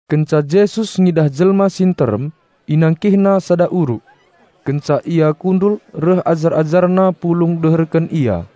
Kenca Jesus ngidah jelma si nterem, InangkihNa sada uruk. Kenca Ia kundul reh ajar-AjarNa pulung deherken Ia.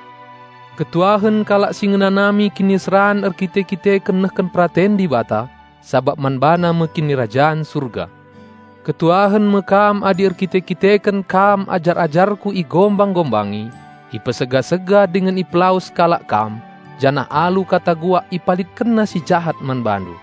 Malem ate tuhu-tuhu iakap kalak si ngenanami kiniseran erkite-kiteken nehken peraten Dibata; sabap man bana me Kinirajan Surga. Malem tuhu-tuhu atendu adi erkite-kiteken kam ajar-ajarKu igombang-gombangi, ipesega-sega dingen ipelawes kalak kam janah alu kata guak ipalitkenna si jahat man bandu.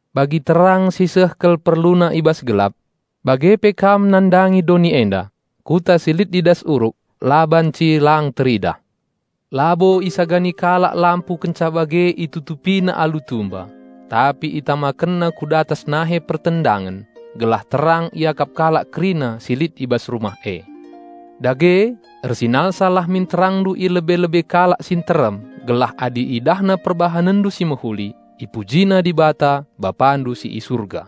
Bagi terang si seh kal perluna i bas gelap, bage pe kam nandangi doni enda. Kuta si lit i das uruk la banci lang teridah. Labo isagani kalak lampu kenca bage itutupina alu tumba; tapi isangketkenna, gelah terang iakap kalak kerina si lit i bas rumah e. Dage, ersinalsal lah min terangndu i lebe-lebe kalak si nterem gelah adi idahna perbahanenndu si mehuli, ipujina Dibata, Bapandu si i Surga."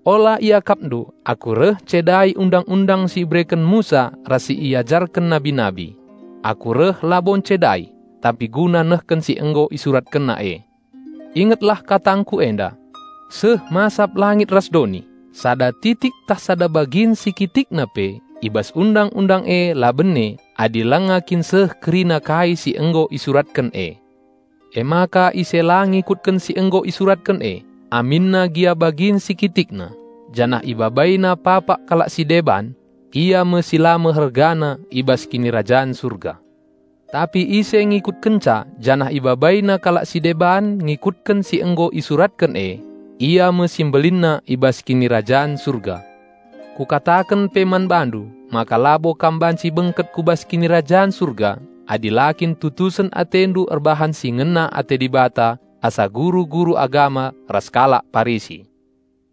"Ola iakapndu Aku reh ncedai Undang-undang si ibereken Musa ras si iajarken nabi-nabi. Aku reh labo ncedai, tapi guna nehken si nggo isuratkenna e. Ingetlah katangKu enda! Seh masap langit ras doni, sada titik ntah sada bagin si kitikna pe i bas Undang-undang e la bene adi langa kin seh kerina kai si nggo isuratken e. Emaka ise la ngikutken si nggo isuratken e, aminna gia bagin si kitikna, janah ibabaina papak kalak si deban, ia me si la mehergana i bas Kinirajan Surga. Tapi ise ngikutkenca janah ibabaina kalak si deban ngikutken si nggo isuratken e, ia me si mbelinna i bas Kinirajan Surga. Kukataken pe man bandu maka labo kam banci bengket ku bas Kinirajan Surga adi la kin tutusen atendu erbahan si ngena ate Dibata asa guru-guru agama ras kalak Parisi."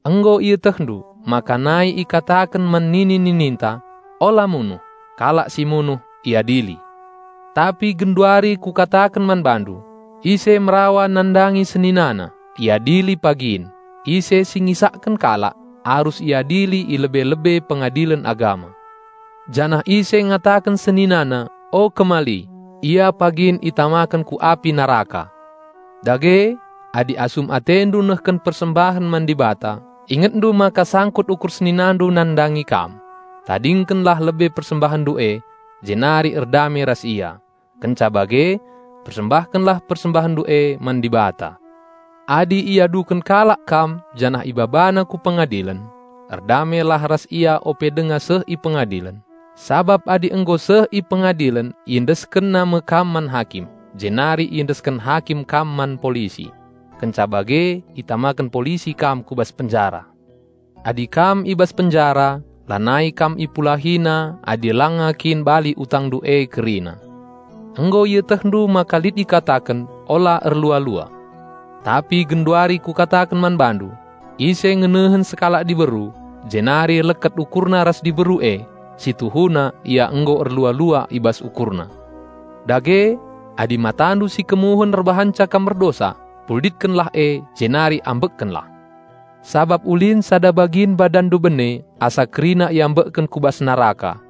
"Nggo ietehndu maka nai ikataken man nini-nininta, 'Ula munuh; kalak si munuh iadili.' Tapi genduari Kukataken man bandu: Ise merawa nandangi seninana, iadili pagin, ise si ngisakken kalak, arus iadili i lebe-lebe Pengadilen Agama. Janah ise ngataken seninana motu dingen la terpake, ia pagin itamaken ku api neraka. Dage, adi asum atendu nehken persembahen man Dibata ingetndu maka sangkut ukur seninandu nandangi kam, tadingkenlah lebe persembahenndu e jenari erdame ras ia. Kenca bage persembahkenlah persembahenndu e man Dibata. Adi iaduken kalak kam janah ibabana ku pengadilen, erdamelah ras ia ope denga seh i pengadilen. Sabap adi nggo seh i pengadilen iendeskenna me kam man hakim, jenari iendesken hakim kam man polisi. Kenca bage itamaken polisi kam ku bas penjara. Adi kam i bas penjara, lanai kam ipulahina adi langa kin bali utangndu e kerina." "Nggo ietehndu maka lit ikataken, 'Ola erlua-lua.' Tapi genduari Kukataken man bandu: Ise mpernehen sekalak diberu, jenari hilo kerincuhna nandangi diberu e, si tuhuna ia nggo erlua-lua i bas ukurna. Dage, adi matandu si kemuhen erbahanca kam erdosa, cungkillah e jenari ambekkenlah! Sabap ulin sembelah badanndu e bene asa kerina iambekken ku bas neraka.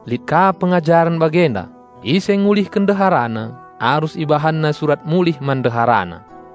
"Lit ka pengajaren bagenda, 'Ise ngulihken ndeharana, arus ibahanna surat mulih man ndeharana!'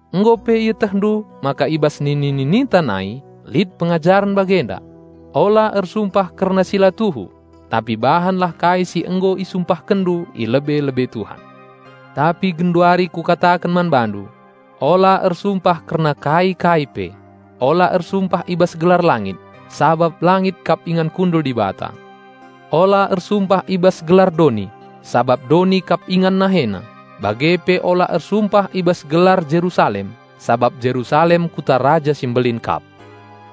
"Nggo pe ietehndu maka i bas nini-nininta nai lit pengajaren bagenda, 'Ola ersumpah kerna si la tuhu, tapi bahanlah kai si nggo isumpahkenndu i lebe-lebe Tuhan.' Tapi genduari Kukataken man bandu: Ola ersumpah kerna kai-kai pe, ula ersumpah i bas gelar langit, sabap langit kap ingan kundul Dibata; ola ersumpah i bas gelar doni, sabap doni kap ingan NaheNa; bage pe ula ersumpah i bas gelar Jerusalem, sabap Jerusalem kuta Raja Simbelin kap.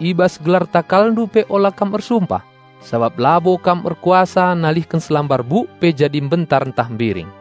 I bas gelar takalndu pe ola kam ersumpah, sabap labo kam erkuasa nalihken selambar buk pe jadi mbentar ntah mbiring.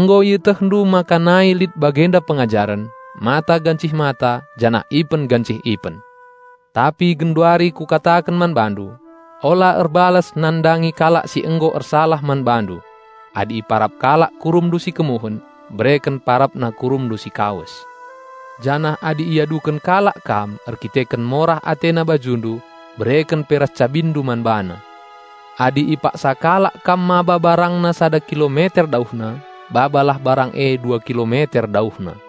"Nggo ietehndu maka nai lit bagenda pengajaren, 'Mata gancih mata, janah ipen gancih ipen.' Tapi genduari Kukataken man bandu: Ula erbalas nandangi kalak si nggo ersalah man bandu. Adi iparap kalak kurumndu si kemuhen, bereken parapna kurumndu si kawes. Janah adi iaduken kalak kam erkiteken morah atena bajundu, bereken pe ras cabinndu man bana. Adi ipaksa kalak kam maba barangna sada kilometer dauhna, babalah barang e dua kilometer dauhna.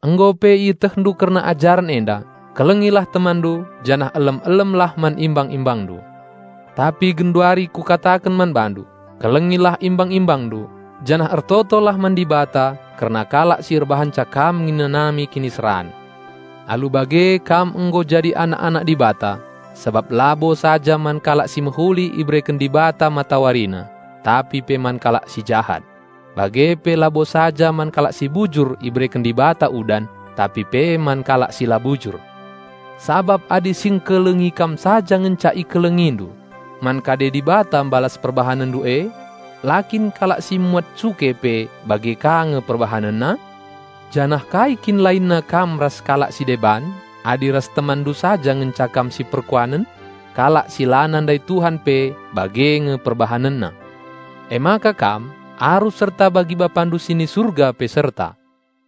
"Nggo pe ietehndu kerna ajaren enda, 'Kelengilah temanndu, janah elem-elemlah man imbang-imbangndu.' Tapi genduari Kukataken man bandu: Kelengilah imbang-imbangndu, janah ertotolah man Dibata kerna kalak si erbahanca kam ngenanami kiniseran. Alu bage kam nggo jadi anak-anak Dibata. Sabap labo saja man kalak si mehuli ibereken Dibata MatawariNa, tapi pe man kalak si jahat. Bage pe labo saja man kalak si bujur ibereken Dibata udan, tapi pe man kalak si la bujur. Sabap adi si ngkelengi kam saja ngenca ikelengindu, man kade Dibata mbalas perbahanenndu e? La kin kalak si muat cuke pe bage ka nge perbahanenna? Janah kai kin lainna kam ras kalak si deban adi ras temanndu saja ngenca kam siperkuanen? Kalak si la nandai Tuhan pe bage nge perbahanenna. Emaka kam arus serta bagi Dibatandu pe serta."